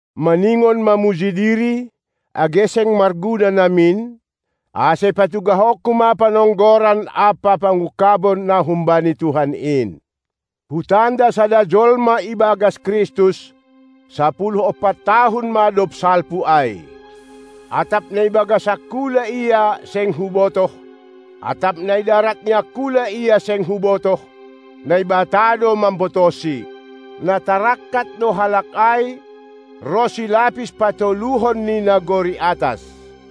Maningon mamuji diri, age seng marguna namin; ase patugahonku ma panonggoran ampa pangungkabon na humbani Tuhan in. Hutanda sada jolma ibagas Kristus; sapuluh ompat tahun ma dob salpu ai (atap na ibagas angkula ia seng hubotoh, atap na idarat ni angkula ia seng hubotoh, Naibata do mambotohsi), na tarangkat do halak ai ronsi lapis patoluhon ni nagori atas.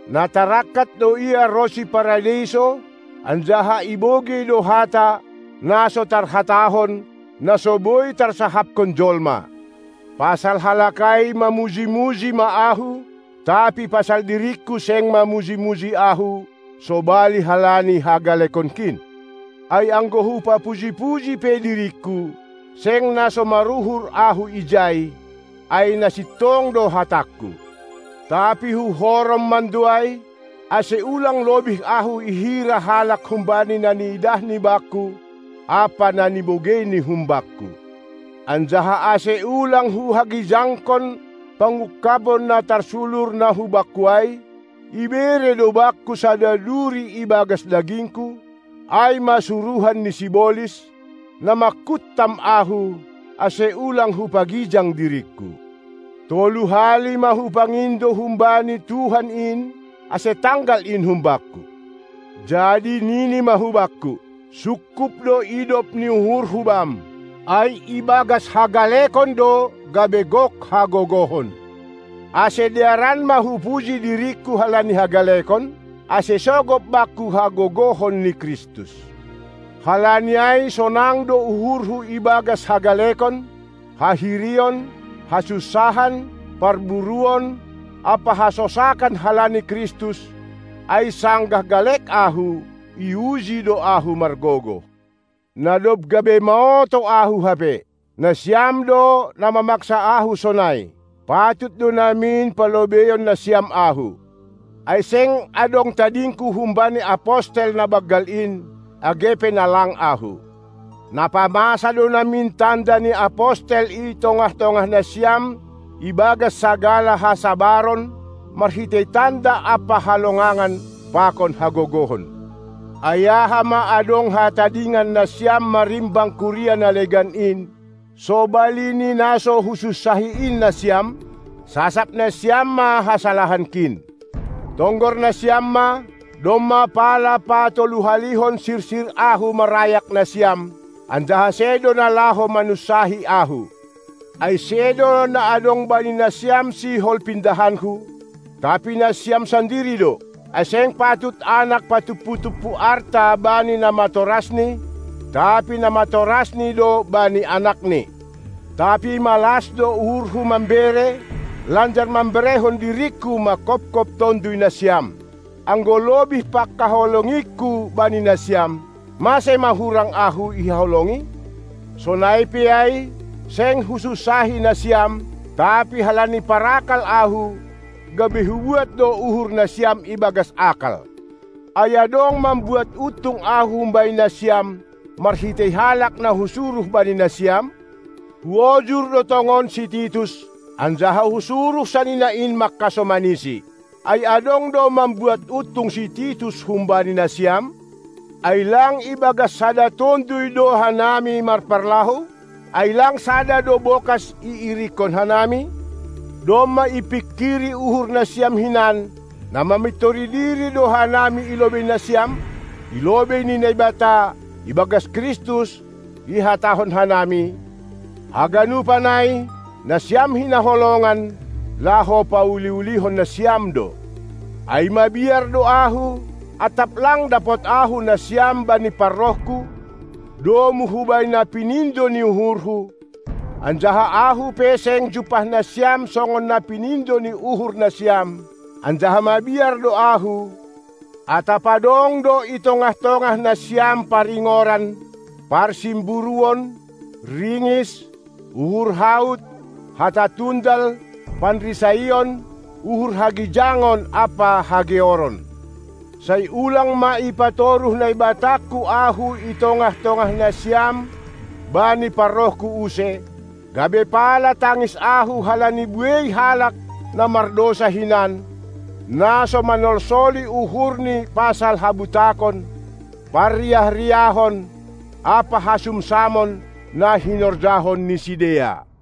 na tarangkat do ia ronsi Paradeiso, anjaha ibogei do hata, na so tarhatahon, na so boi tarsahaphon jolma. Pasal halak ai mamuji-muji ma ahu, tapi pasal diringku seng mamuji-muji ahu sobali halani hagalekonkin. Ai anggo hupapuji-puji pe diringku, seng na so maruhur ahu ijai, ai na sintong do hatangku. Tapi huhorom mando ai, ase ulang lobih ahu ihira halak humbani na niidahni bakku ampa na binogeini humbakku. Anjaha, ase ulang huhagijangkon pangungkabon na tarsulur na hubakku ai, ibere do bakku sada duri ibagas dagingku, ai ma suruhan ni sibolis, na manghantam ahu, ase ulang hupagijang diringku. Tolu hali ma hupangindo humbani Tuhan in, ase tanggal in humbakku. Jadi nini ma hubakku: Sungkup do idop ni uhurHu bam, ai ibagas hagalekon do gabe gok hagogohon. Ase dearan ma hupuji diringku halani hagalekon, ase sogop bakku hagogohon ni Kristus. Halani ai sonang do uhurhu ibagas hagalekon, hahirion, hasunsahan, parburuon ampa hasosakan halani Kristus, ai sanggah galek ahu, iuji do ahu margogoh. Na dob gabe maoto ahu hape! Nasiam do na mamaksa ahu sonai. Patut do namin palobeion nasiam ahu. Ai seng adong tadingku humbani apostel na banggal in, age pe na lang ahu. Napamasa do namin tanda ni apostel i tongah-tongah nasiam ibagas sagala hasabaron, marhitei tanda ampa halongangan pakon hagogohon. Ai aha ma adong hatadingan nasiam marimbang kuria na legan in, sobali ni na so husunsahi in nasiam? Sasap nasiam ma hasalahankin! Tonggor nasiam ma, domma pala patoluhalihon sirsir ahu marayak nasiam, anjaha sedo na laho manunsahi ahu. Ai sedo na adong bani nasiam sihol pindahanku, tapi nasiam sandiri do. Ai seng patut anak patumpu-tumpu arta bani namatorasni, tapi namatorasni do bani anakni. Tapi malas do uhurhu mambere, lanjar mamberehon diringku manghophop tonduy nasiam. Anggo lobih panghaholongingku bani nasiam, mase ma hurang ahu ihaholongi? Sonai pe ai, seng husunsahi nasiam, tapi halani parakal ahu, gabe hubuat do uhur nasiam ibagas akal. Ai adong mambuat untung ahu humbani nasiam, marhitei halak na husuruh bani nasiam? Huojur do tongon si Titus, anjaha husuruh sanina in manghasomanisi. Ai adong do mambuat untung si Titus humbani nasiam? Ai lang ibagas sada Tonduy do hanami marparlahou? Ai lang sada do bokas iirikkon hanami? Domma ipingkir uhur nasiam hinan, na mamintori diri do hanami i lobei nasiam? I lobei ni Naibata, ibagas Kristus ihatahon hanami: Haganupan ai, nasiam hinaholongan, laho pauli-ulihon nasiam do. Ai mabiar do ahu, atap lang dapot ahu nasiam bani parrohku, domu hubani na pinindo ni uhurhu, anjaha ahu pe seng jumpah nasiam songon na pinindo ni uhur nasiam, anjaha mabiar do ahu, atap adong do i tongah-tongah nasiam paringoran, parsimburuon, ringis, uhur haut, hata tundal, panrisaon, uhur hagijangon ampa hageoron. Sai ulang ma ipatoruh Naibatangku ahu i tongah-tongah nasiam bani parrohku use, gabe pala tangis ahu halani buei halak na mardousa hinan, na so manolsoli uhurni pasal habutakon, parriah-riahon ampa hasumsamon, na hinorjahon ni sidea.